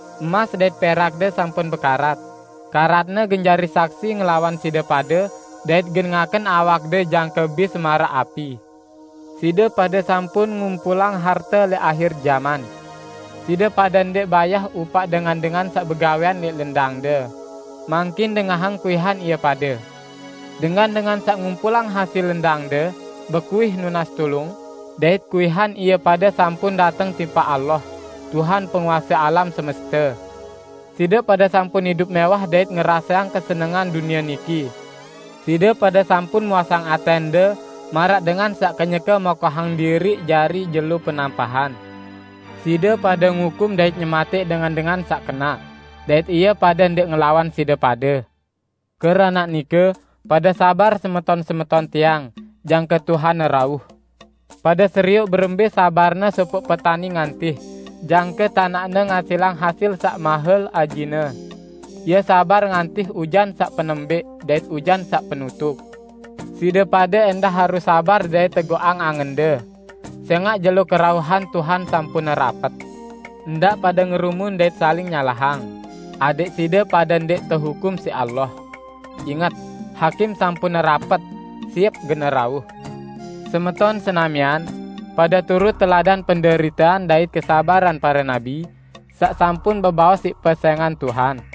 Emas dait perakde sampun bekarat; karatne gen jari saksi ngelawan side pade dait gen ngaken awakde jangke bis maraq api. Side pade sampun ngumpulang harte lẽq ahir jaman. Side pade ndẽq bayah upaq dengan-dengan saq begawẽan lẽq lendangde. Mangkin dengahang kuihan ie pade! Dengan-dengan saq ngumpulang hasil lendangde, bekuih nunas tulung, dait kuihan ie pade sampun dateng tipaq Allah, Tuhan penguase alam semeste. Side pade sampun idup mẽwah dait ngeraseang kesenengan dunie niki. Side pade sampun muasang atẽnde maraq dengan saq kenyeke mokohang diriq jari jelo penampahan. Side pade ngukum dait nyematẽq dengan-dengan saq kenaq, dait ie pade ndẽq ngelawan side pade. Keranaq nike, pade sabar semeton-semeton tiang, jangke Tuhan rauh. Pade serioq berembẽ sabarne sopoq petani ngantih jangke tanaqne ngasilang hasil saq mahel ajine. Ie sabar ngantih ujan saq penembẽq dait ujan saq penutuq. Side pade ẽndah harus sabar dait teguqang angende, sẽngaq jelo kerauhan Tuhan sampun rapet. Ndaq pade ngerumun dait saling nyalahang, adẽq side pade ndẽq tehukum siq Allah. Inget! Hakim sampun rapet, siep gen rauh. Semeton senamian, pade turut teladan penderitean dait kesabaran pare nabi saq sampun bebaos siq pesẽngan Tuhan.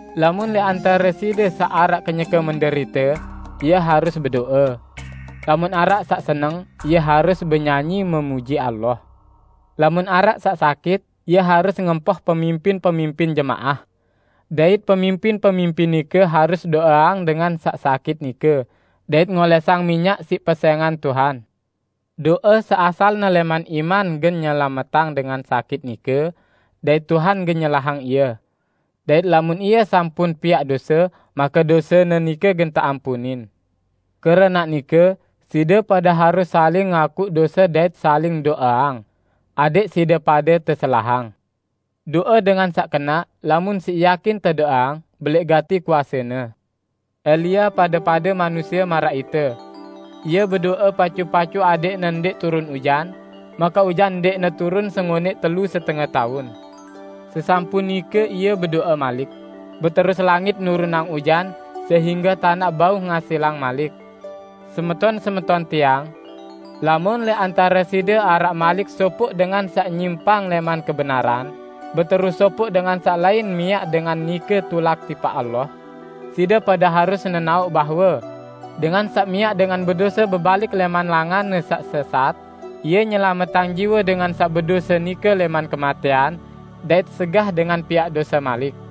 Lamun lẽq antare side araq saq kenyeke menderite, ie harus bedo'e. Lamun araq saq seneng, ie harus benyanyi memuji Allah. Lamun araq saq sakit, ie harus ngempoh pemimpin-pemimpin jemaah. Dait pemimpin-pemimpin nike harus do'eang dengan saq sakit nike dait ngolẽsang minyak siq pesẽngan Tuhan. Do'e saq asalne lẽman iman gen nyelametang dengan sakit nike dait Tuhan gen nyelahang ie; dait lamun ie sampun piaq dose, make dosene nike gen teampunin. Keranaq nike, side pade harus saling ngakuq dose dait saling do'eang, adẽq side pade teselahang. Do'e dengan saq kenaq lamun siq yakin tedo'eang, belẽq gati kuasene. Elia pade-pade manusie maraq ite. Ie bedo'e pacu-pacu adẽqne ndẽq turun ujan, make ujan ndẽqne turun sengonẽq telu setenge taun. Sesampun nike ie bedo'e malik, beterus langit nurunang ujan sehingge tanaq bau ngasilang malik. Semeton-semeton tiang! Lamun lẽq antare side araq malik sopoq dengan saq nyimpang lẽman kebenaran, beterus sopoq dengan saq lain miaq dengan nike tulak tipaq Allah, side pade harus nenaoq bahwe: Dengan saq miaq dengan bedose bebalik lẽman langanne saq sesat, ie nyelametang jiwe dengan saq bedose nike lẽman kematẽan dait segah dengan piaq dose malik.